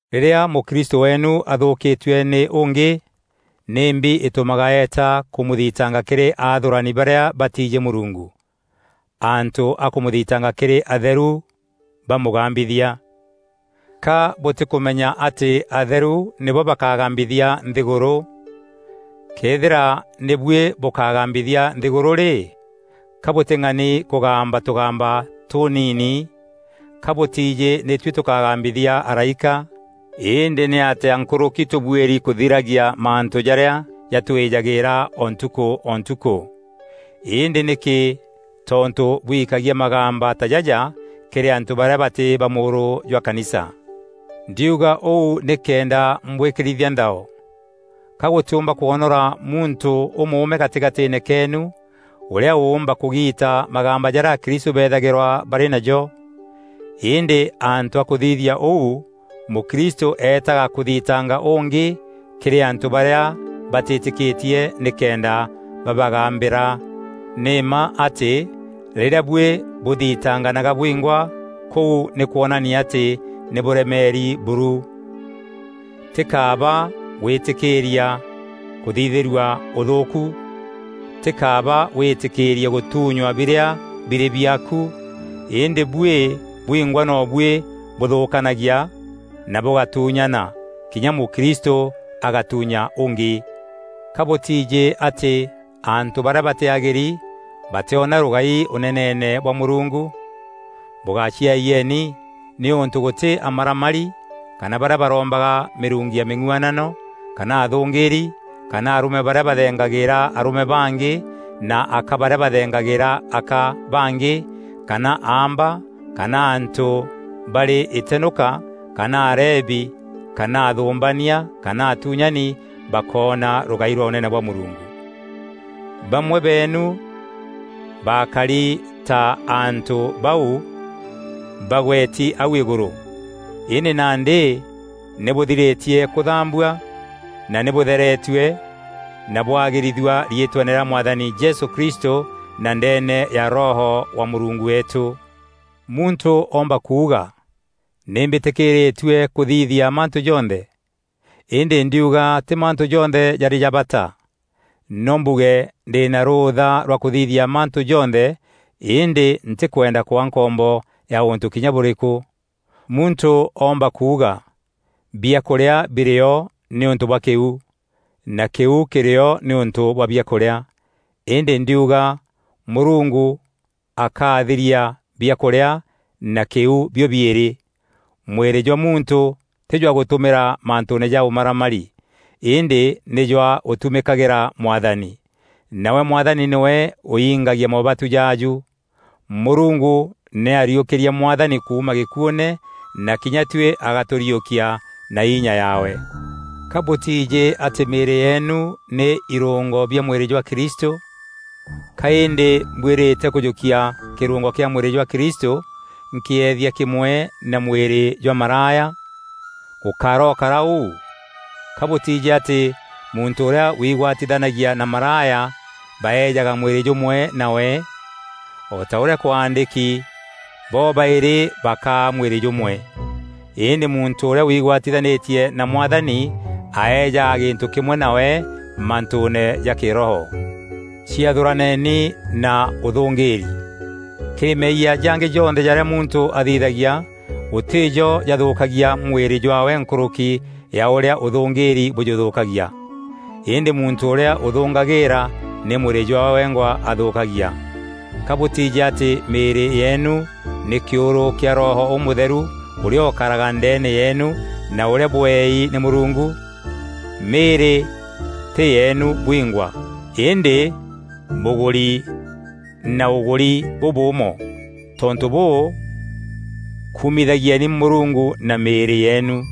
Rîrîa mûkristû weenu athûkîtue nî ûngî, nîmbi îtûmaga eeta kûmûthitanga kîrî aathûrani barîa batiijî Mûrungu, antû a kûmûthitanga kîrî atheru bamûgambithia? Ka bûtîkûmenya atî atheru nîbo bakagambithia nthîgûrû? Këethîra nî buî bûkagambithia nthîgûrû rî, ka bûtîng'ani kûgamba tûgamba tûniini? Ka bûtiijî nî tuî tûkagambithia araîka? Îndî nîatîa nkûrûki tûbuîri kûthiragia mantû jarîa jatwîjagîîra o ntukû o ntukû? Îndî nîkî tontû bwikagia magamba ta jaja kîrî antû barîa batî ba mûûrû jwa kanisa? Ndiuga ûu nîkenda mbwîkîrithia nthao. Ka gûtîûmba kwonora muntû ûmûûme gatîgatîîne keenu ûrîa ûûmba kûgiita magamba jarîa akristû beethagîrwa barî najo? Îndî antû a kûthithia ûu, mûkristû eetaga kûthitanga ûngî kîrî antû barîa batîtîkîtie nîkenda babagambîra! Nî mma atî rîrîa buî bûthitanganaga bwingwa kûu nî kwonania atî nî bûremeeri buru. Ti kaaba gwîtîkîîria kûthithîrua ûthûûku? Tî kaaba wîtîkîîrie gûtunywa birîa birî biaaku? Îndî buî bwingwa no buî bûthûûkanagia na bûgatuunyana, kinya mûkristû agatuunya ûngî. Ka bûtiijî atî antû barîa batîagîri batîona rûgai Ûneneene bwa Mûrungu? Bûgaciayieni, nîûntû gûtî amaramari kana barîa barombaga mîrungu ya mîng'uanano kana athûngîîri kana arûme barîa bathengagîîra arûme bangî na aka barîa bathengagîîra aka bangî kana aamba kana antû barî îtenûka kana arebi kana athûmbania kana atuunyani, bakoona rûgai rwa Ûnene bwa Mûrungu. Bamwe beenu baakari ta antû bau bagweti au îgûrû. Îndî nandî nî bûthirîtie kûthambua na nî bûtheretue na bwagîrithua riîtweene rîa Mwathani Jesû Kristû na ndeene ya Roho wa Mûrungu weetû. Muntû oomba kuuga, “Nî mbîtîkîîrîtue kûthithia mantû jonthe.” Îndî ndiuga tî mantû jonthe jarî ja bata. No mbuge ndî na rûûtha rwa kûthithia mantû jonthe, îndî ntîkwenda kwaa nkombo ya ûntû kinya bûrîkû. Muntû oomba kuuga, “Biakûrîa birîo nîûntû bwa kîu na kîu kîrîo nîûntû bwa biakûrîa.” Îndî ndiuga Mûrungu akaathiria biakûrîa na kîu bio-biîrî. Mwîrî jwa muntû tî jwa gûtumîra mantûûne ja ûmaramari, îndî nî jwa gûtumîkagîra Mwathani, nawe Mwathani nîwe ûingagia moobatu jaaju. Mûrungu nî ariûkîrie Mwathani kuuma gîkuûne na kinya tuî agatûriûkia na inya yaawe. Ka bûtiijî atî mîîrî yeenu nî irûngo bia mwîrî jwa Kristû? Ka îndî mbwîrîte kûjûkia kîrûngo kîa mwîrî jwa Kristû nkîeethia kîmwe na mwîrî jwa maraya? Gûkarokarîka ûu! Ka bûtiijî atî muntû ûrîa wigwatithanagia na maraya baejaga mwîrî jûmwe nawe? O ta ûrîa kwaandîki, “Bobaîrî bakaa mwîrî jûmwe.” Îndî muntû ûrîa wigwatithanîtie na Mwathani aejaga gîntû kîmwe nawe mantûûne ja Kîroho. Ciathûraneni na ûthûngîîri. Kîrî meeyia jangî jonthe jarîa muntû athithagia gûtî jo jathûkagia mwîrî jwaawe nkûrûki ya ûrîa ûthûngîîri bûjûthûkagia. Îndî muntû ûrîa ûthûngagîîra nî mwîrî jwaawe wengwa athûkagia. Ka bûtiijî atî mîîrî yeenu nî kîûrû kîa Roho Ûmûtheru ûrîa ûkaraga ndeene yeenu na ûrîa bweei nî Mûrungu? Mîîrî tî yeenu bwingwa, îndî bûgûri na ûgûri bûbûûmo. Tontû bûû, kumithagieni Mûrungu na mîîrî yeenu.